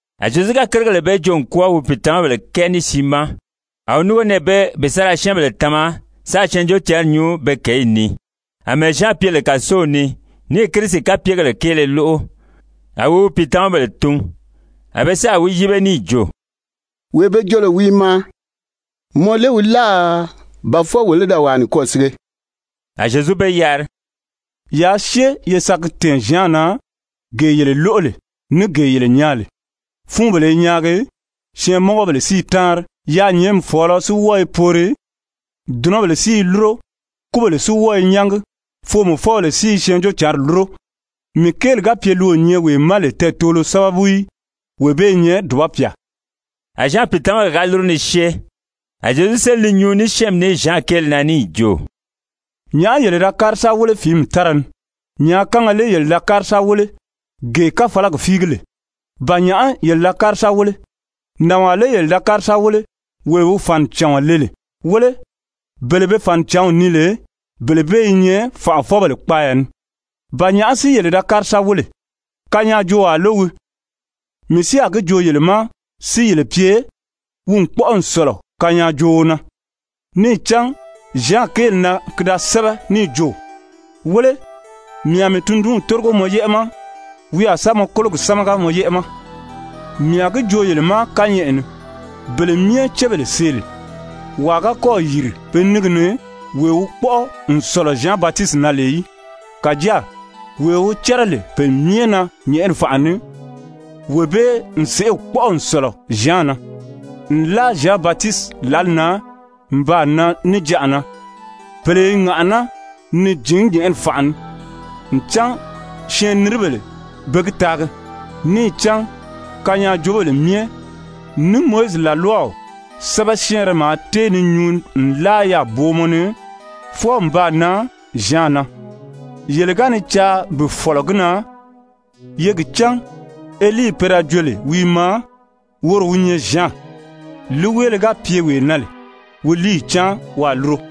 A Zyezu ga kérigèle bee joo n kwɔ́ɔ wi pìitamabèle kɛɛ ní siin ma, a wi núngo nɛɛ bee bi sa ra syɛ́ɛnbèle tama sáā Syɛɛnjóocǎnri nyuu be kěyi ni. Amɛɛ Zyan pye lè kàsow ni níì Kirisi kapyegèle kéele lóʔo, a wi wi pìitamabèle tun. A be sáà wi yíbe níì jo: «Wee be jo lè wi i maa, mɔ lé wi láà, ba fwɔɔ wolo í da wàa nikwɔɔ sige?» A Zyezu be yari: «Yaa syée ye sa gi tɛ̀ɛn Zyan na, gee yele lóʔo lè ní gee yele nyaa lè. Fúunbèle i nyaagi, syɛɛnmɔngɔbèle si i táanri, yaanyɛɛnmi fɔ̀ɔlɔ si wɔ́ɔ i poori, dùnɔbèle si i lúro, kúbèle si wɔ́ɔ i nyángi, foomɔfɔbèle si i Syɛɛnjóocǎnri lúro. Mii kéeli ga pye li o nyɛ wee ma lè tɛɛtoolo sábabu í, wee bee i nyɛ dùba pyà!» A Zyan pìitamabèle ga lúru ni syée, a Zyezu séli ni nyuu ní syɛ́ɛnmi ní Zyan kéeli na níì jo: «Nyàʔá yele da kári sa wéle fìími tára ni? Nyàákanga lé yele da kári sa wéle, gee káfalagi fíigi lè? Ba nyàʔá yele da kári sa wéle? Nànwaa lé yele da kári sa wéle, wee wi fànicàɔn le lè? Wéle, bele be fànicǎnw nii lè, bele bee i nyɛ fànʔafɔbèle kpaaya ni. Ba nyàʔá si yele da kári sa wéle? Kanyaajoowaa lé wii? Mii si a gi joo yele ma si yele pye, wi n kpɔ́ʔɔ n sɔ̀lɔ kanyaajooo na. Níì cán Zyan kéeli na ki da sɛ́bɛ níì jo: ‹Wéle, mii a mii tundunw tórigo mɔ yɛ́ʔɛ ma. Wi a sa mɔ kólogi sámaga mɔ yɛ́ʔɛ ma.› Mii a gi joo yele ma kányɛʔɛ ni, bele myɛ cébèle see lè, wàa ga kɔ́ɔ̀ yìri pe níngi ni wee wi kpɔ́ʔɔ n sɔ̀lɔ Zyan Batisiti na lè í. Kàjáa wee wi cɛ́rɛ lè pe myɛ na nyɛ̀ʔɛni fànʔa ni, wee bee n sèʔê kpɔ́ʔɔ n sɔ̀lɔ Zyan na. Nlaʔa Zyan Batisiti lǎli na n baa nan níjanʔa na, pèle i ŋàʔaná ni jǐn nyɛ̀ʔɛni fànʔa ni, ncan syɛɛnniribèle be gi taagi. Níì cán kanyaajoobèle myɛ, ní Mowizi làlwaw sɛ́bɛ syɛ́ɛnrɛ maa tée ni nyuu nlaa yaà booma ni fwɔɔ n baa nan Zyan na. Yele ga ni caa bi fɔ̀lɔ gi na, ye gi cán Elii pe da jo lè wi i maa, woro wi nyɛ Zyan. Líiweele ga pye wee na lè, wi líiyi cáan waa lúro.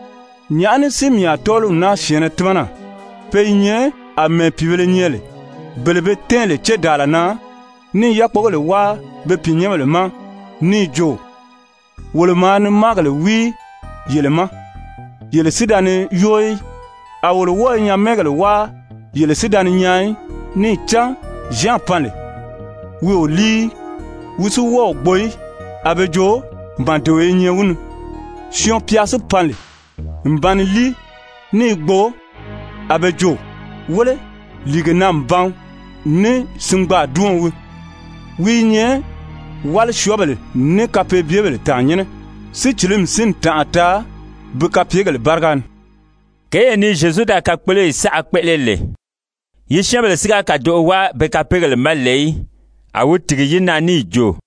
Nyàʔá ní si mii a tɔ́ɔliw naa syɛ̀ɛnnɛ tímana? Pe i nyɛ àmɛɛ pìibēle nyɛ lè, bele be tɛ́ɛn lè cédaala na, ní i yákpogèle wáa be pìinyɛnbèle ma níì jo: ‹Wolo maa ni máagèle wíi yele ma, yele si da ni yóo í. A wolo wɔ́ɔ i nyamɛɛgèle wáa, yele si da ni nyaan í.› Níì cán Zyan pan lè, wi o líi í, wi si wɔ́ɔ o gbo í, a be jo: ‹Màdeo i nyɛ wi ni.› Syɔɔn-pya si pan lè n ba ni líi ní i gbo, a be jo: ‹Wéle, lìigena-n-ban ní singbaadiɔn wii. Wi i nyɛ wálisyɔɔbèle ní kapeebyebèle tàannyɛnnɛ.› Sícilimi si n tànʔa taa bi kapyegèle báriga ni.» Kěyee ni Zyezu da kakpoloyi saʔa kpéʔele lè, yi syɛ́ɛnbèle si ga kàdoʔo wáa be kapeegèle ma lè í, a wi tìgi yi na níì jo: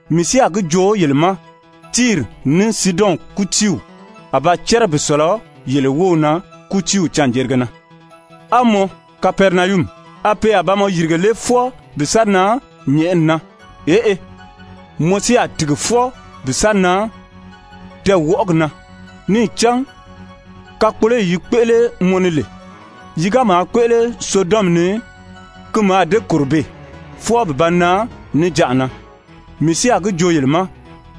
Mii si a gi joo yele ma, Tiiri, ní Siidɔn kútiiw a ba cɛ́rɛ bi sɔ̀lɔ yele wów na kútiiw canjerige na. A mɔ, Kapɛrinayumi, a pe a ba mɔ yìrige lé fwɔɔ bi sa nan nyɛ̀ʔɛni na? Eʔe, mɔ si a tìgi fwɔɔ bi sa nan tɛɛwɔʔɔgi na. Níì cán kakpoloyi yi kpéʔele mɔ ni lè, yi ga maa kpéʔele Sodɔmi ni, ki mǎà dée kòro beè, fwɔɔ bi ba nan níjanʔa na. Mii si a gi joo yele ma,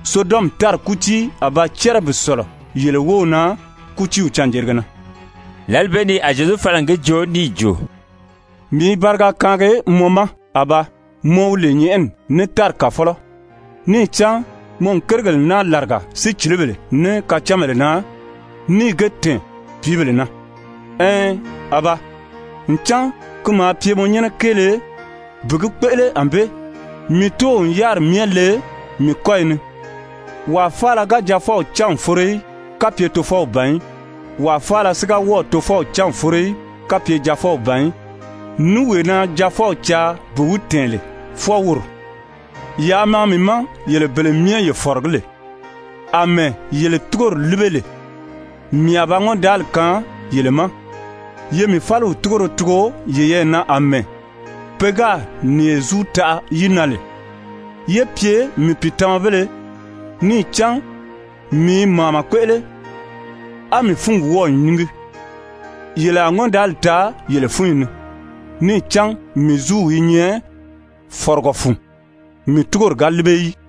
Sodɔmi tári kútii a ba cɛ́rɛ bi sɔ̀lɔ yele wów na kútiiw canjerige na.» Lǎli bee ni a Zyezu fala n gi joo níì jo: «Mii i bariga kaangi mɔ ma, Abaa, mɔ wi lè nyɛ̀ʔɛni ní tári Kàfɔlɔ, níì cán mɔ n kérigèle naa làriga sícilibèle ní kacánbèle na, níì ge tɛ̀ɛn pìíbèle na. Ɛɛn, Abaa, ncan ki maa pye mɔ nyɛ́nɛ kéele bi gi kpéʔele ànbée. Mii Tóow n yáriri myɛ le mii kɔ́yi ni. Wàa faala ga Jaafɔw cán n foro í, kapye Tofɔw ban í. Wàa faala si ga wɔ́ɔ̀ Tofɔw cán n foro í, kapye Jaafɔw ban í, ní wee na Jaafɔw caa bi wi tɛ̀ɛn lè, fwɔɔ woro. Yaa maa mii ma yele bele myɛ ye fɔ̀rɔgí lè, àmɛɛ yele túgori líbe lè, mii a ba ŋɔ́ndaali kaan yele ma. Ye mii fáliw túgoro tugo yeyɛɛ na àmɛɛ pe gáà nìye zúu taʔa yi na lè, ye pye mii pìitamabéle. Níì cán mii i màama kpéʔele, á mii fúngi wɔ́ɔ̀ nyíngi. Yele a ŋɔ́ndaali taa yele fúnyi ni. Níì cán mii zúuw i nyɛ fɔ̀rɔgɔ fun, mii túgori ga líbe í.»